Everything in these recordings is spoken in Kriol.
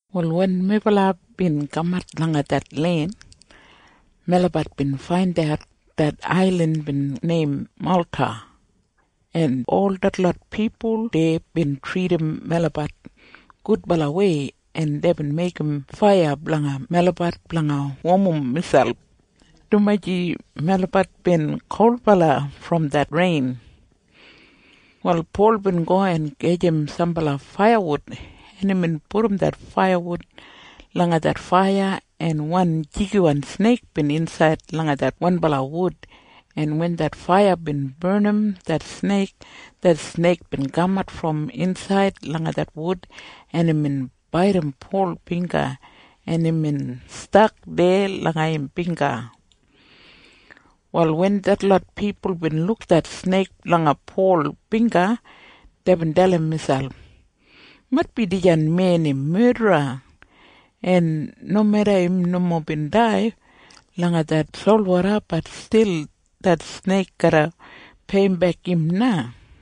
Wal wen melabat bin kamat langa det len, melabat bin faindat det ailin bin neim Malta, en ol detlot pipul deya bin tridim melabat gudbalawei, en deibin meigim faiya blanga melabat blanga womim miselp, dumaji melabat bin kolbala brom det rein. Wal Pol bin go en gajim sambala faiyawud, en imbin pudum det faiyawud langa det faiya, en wan jigiwan sneik bin insaid langa det wanbala wud, en wen det faiya bin barnim det sneik, det sneik bin kamat brom insaid langa det wud, en imbin baidim Pol bingga, en imbin stak deya langa im bingga. Wal wen detlot pipul bin luk det sneik langa Pol bingga, deibin dalim miselp, “Maitbi dijan men im medra, en nomeda im nomo bin dai langa det solwoda, bat stil det sneik garra peiyimbek im na.”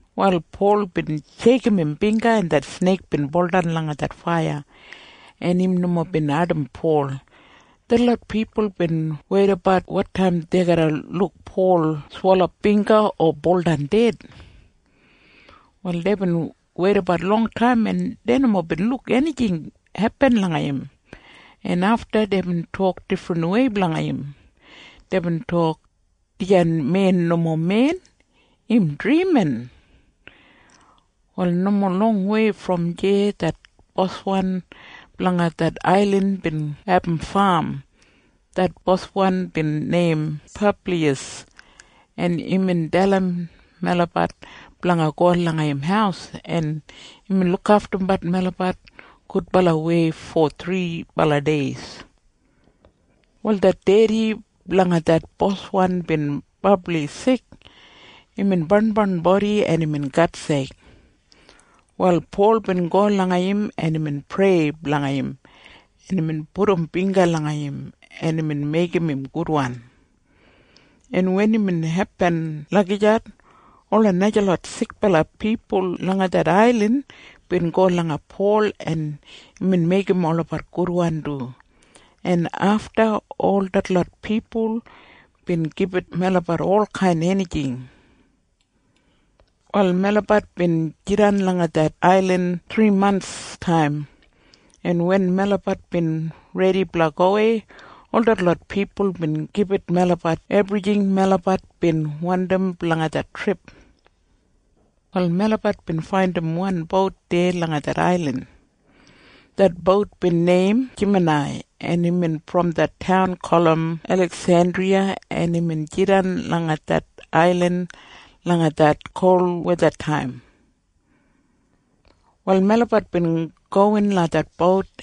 Wal Pol bin sheikim im bingga, en det sneik bin buldan langa det faiya, en im nomo bin ardim Pol. Detlot pipul bin weidabat wotaim dei garra luk Pol swelap bingga o buldan ded. Wal deibin weidabat longtaim, en dei nomo bin luk enijing hepin langa im, en afta deibin tok difrinwei blanga im. Deibin tok, “Dijan men nomo men. Im drimin!” Wal nomo longwei brom deya det boswan blanga det ailin bin abum fam. Det boswan bin neim Publiyas, en imbin dalim melabat blanga go langa im haus, en imbin lukaftum melabat gudbalawei fo thribala dei. Wal det dedi blanga det boswan bin brabli sik. Imbin barnbarn bodi en imbin gatseik. Wal Pol bin go langa im, en imbin prei blanga im, en imbin pudum bingga langa im, en imbin meigim im gudwan, en wen imbin hepin lagijat, ola najalot sikbala pipul langa det ailin bin go langa Pol, en imbin meigim olabat gudwan du, en afta ol detlot pipul bin gibit melabat olkain enijing. Wal melabat bin jidan langa det ailin thrimantstaim, en wen melabat bin redi blanga gowei, ol detlot pipul bin gibit melabat ebrijing melabat bin wandim blanga det trip. Wal melabat bin faindim wan bout deya langa det ailin. Det bout bin neim Jemanai, en imbin brom det taun gulum Eliksendriya, en imbin jidan langa det ailin langa det kolwethataim. Wal melabat bin gowin langa det bout,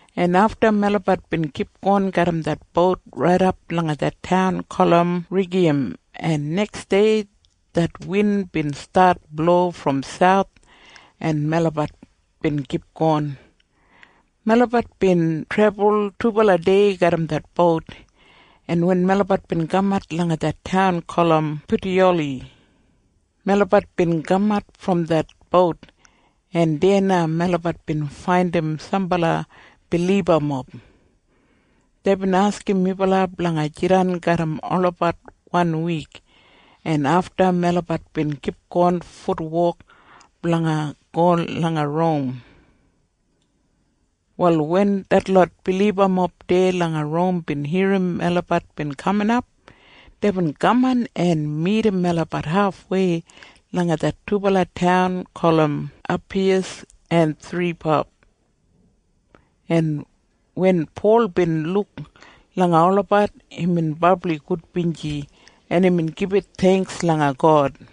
en afta melabat bin kipgon garram det bout raidap langa det taun gulum Rigiyam, en neksdei det win bin stat blo brom sauth, en melabat bin kipgon. Melabat bin trebul tubala dei garram det bout, en wen melabat bin kamat langa det taun gulum Putiyoli, melabat bin kamat brom det bout, en deya na melabat bin faindim sambala bilibamob. Deibin askim melabat blanga jidan garram olabat wan wik, en afta melabat bin kipgon futwok blanga go langa Rom. Wal wen detlot bilibamob deya langa Rom bin irrim melabat bin kaminap, deibin kaman en midim melabat hafwei langa det dubala taun gulum Apiyas en Thripab, en wen Pol bin luk langa olabat, imbin brabli gudbinji, en imbin gibit theingks langa God.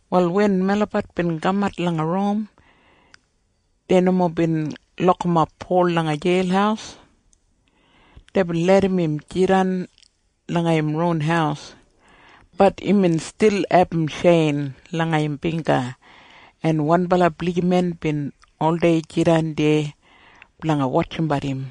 Wal wen melabat bin kamat langa Rom, dei nomo bin lokimap Pol langa jeil. Deibin larram im jidan langa im ron haus. Bat imbin stil abum tjein langa im bingga, en wanbala blijiman bin oldei jidan deya blanga wotjimbat im.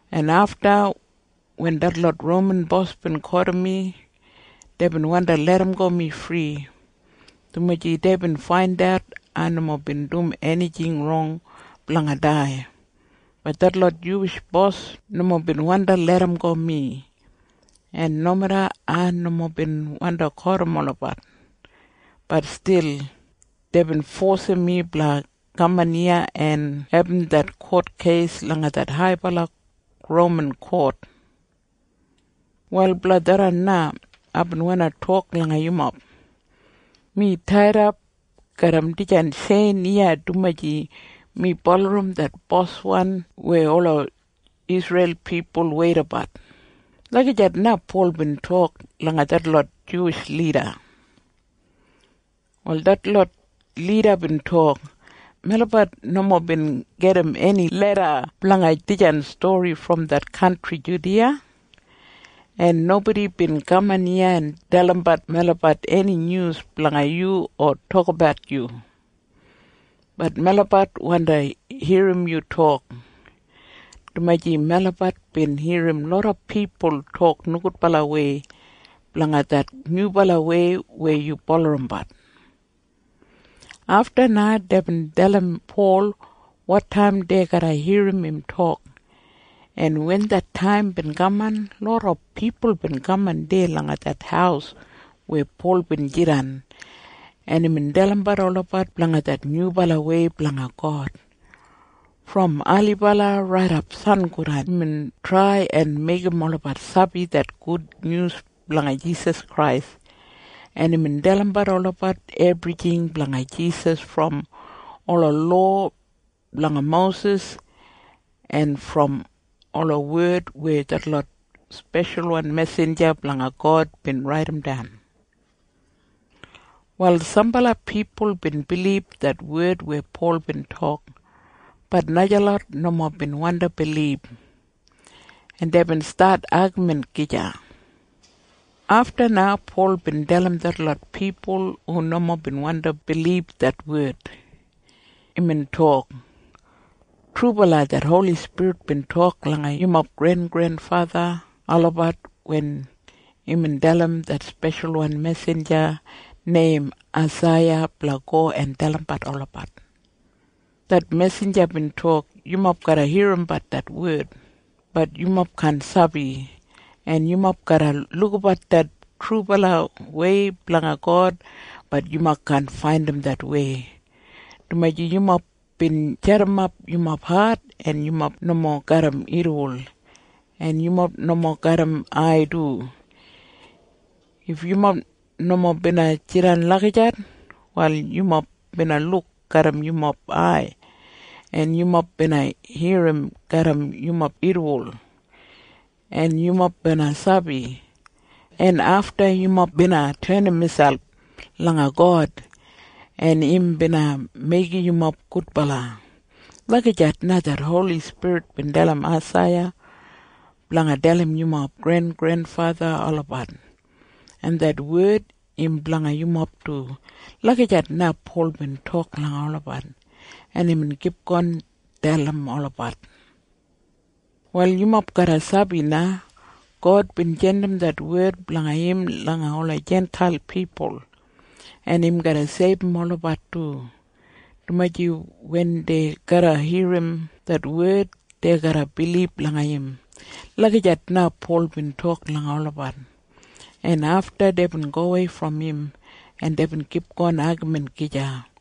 en afta wen detlot Roman bos bin kotim mi, deibin wandi larramgo mi fri, dumaji deibin faindat ai nomo bin dum enijing rong blanga dai. Bat detlot Juwish bos nomo bin wandi larramgo mi, en nomeda ai nomo bin wandi kotim olabat, bat stil deibin fosim mi blanga kaman iya en abum det kotkeis langa det haibala Roman kot. Wal blanga tharran na aibin wandi tok langa yumob. Mi taidap garram dijan tjein iya dumaji mi bulurrum det Boswan weya ola Isreil pipul weidabat.” Lagijat na Pol bin tok langa detlot Juwish lida. Wal detlot lida bin tok, “Melabat nomo bin gedim eni leda blanga dijan stori brom det kantri Judiya, en nobodi bin kaman iya en dalimbat melabat eni nyus blanga yu o tokabat yu. Bat melabat wandi irrim yu tok, dumaji melabat bin irrim loda pipul tok nogudbalawei blanga det nyubalawei weya yu bulurrumbat.” Afta na deibin dalim Pol wotaim dei garra irrim im tok, en wen det taim bin kaman, loda pipul bin kaman deya langa det haus weya Pol bin jidan, en imbin dalimbat olabat blanga det nyubalawei blanga God. Brom ailibala raidap sangodan imbin trai en meigim olabat sabi det gudnyus blanga Jisas Krais, en imbin dalimbat olabat ebrijing blanga Jisas brom ola lowa blanga Mosis en brom ola wed weya detlot speshal mesinja blanga God bin raidimdan. Wal sambala pipul bin bilib det wed weya Pol bin tok. Bat najalot nomo bin wandi bilib, en deibin stat agamin gija. Afta na Pol bin dalim detlot pipul hu nomo bin wandi bilib det wed. Imbin tok, “Trubala det Holi Spirit bin tok langa yumob grengrenfatha olabat wen imbin dalim det speshalwan mesinja neim Aisaiya blanga go en dalim olabat. Det mesinja bin tok, ‘Yumob garra irrimbat det wed. Bat yumob kaan sabi. En yumob garra lukabat det trubalawei blanga God. Bat yumob kaan faindim det wei, dumaji yumob bin jadimap yumob hat, en yumob nomo garram irriwol, en yumob nomo garram ai du. If yumob nomo bina jidan lagijat, wal yumob bina luk garram yumob ai, en yumob bina irrim garram yumob irriwol, en yumob bina sabi, en afta yumob bina tenim miselp langa God, en im bina meigim yumob gudbala.’ Lagijat na det Holi Spirit bin dalim Aisaiya blanga dalim yumob grengrenfatha olabat, en det wed im blanga yumob du.” Lagijat na Pol bin tok langa olabat, en imbin kipgon dalim olabat. “Wal yumob garra sabi na. God bin jandim det wed blanga im langa ola Jintail pipul, en im garra seibum olabat du, dumaji wen dei garra irrim det wed, dei garra bilib langa im.” Lagijat na Pol bin tok langa olabat, en afta deibin gowei brom im, en deibin kipgon agamin gija.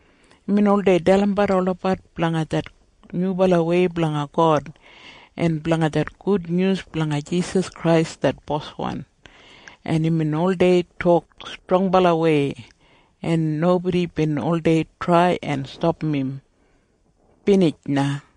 Imbin oldei dalimbat olabat blanga det nyubalawei blanga God en blanga det gudnyus blanga Jisas Krais det Boswan, en imbin oldei tok strongbalawei, en nobodi bin oldei trai en stapam im. Binij na.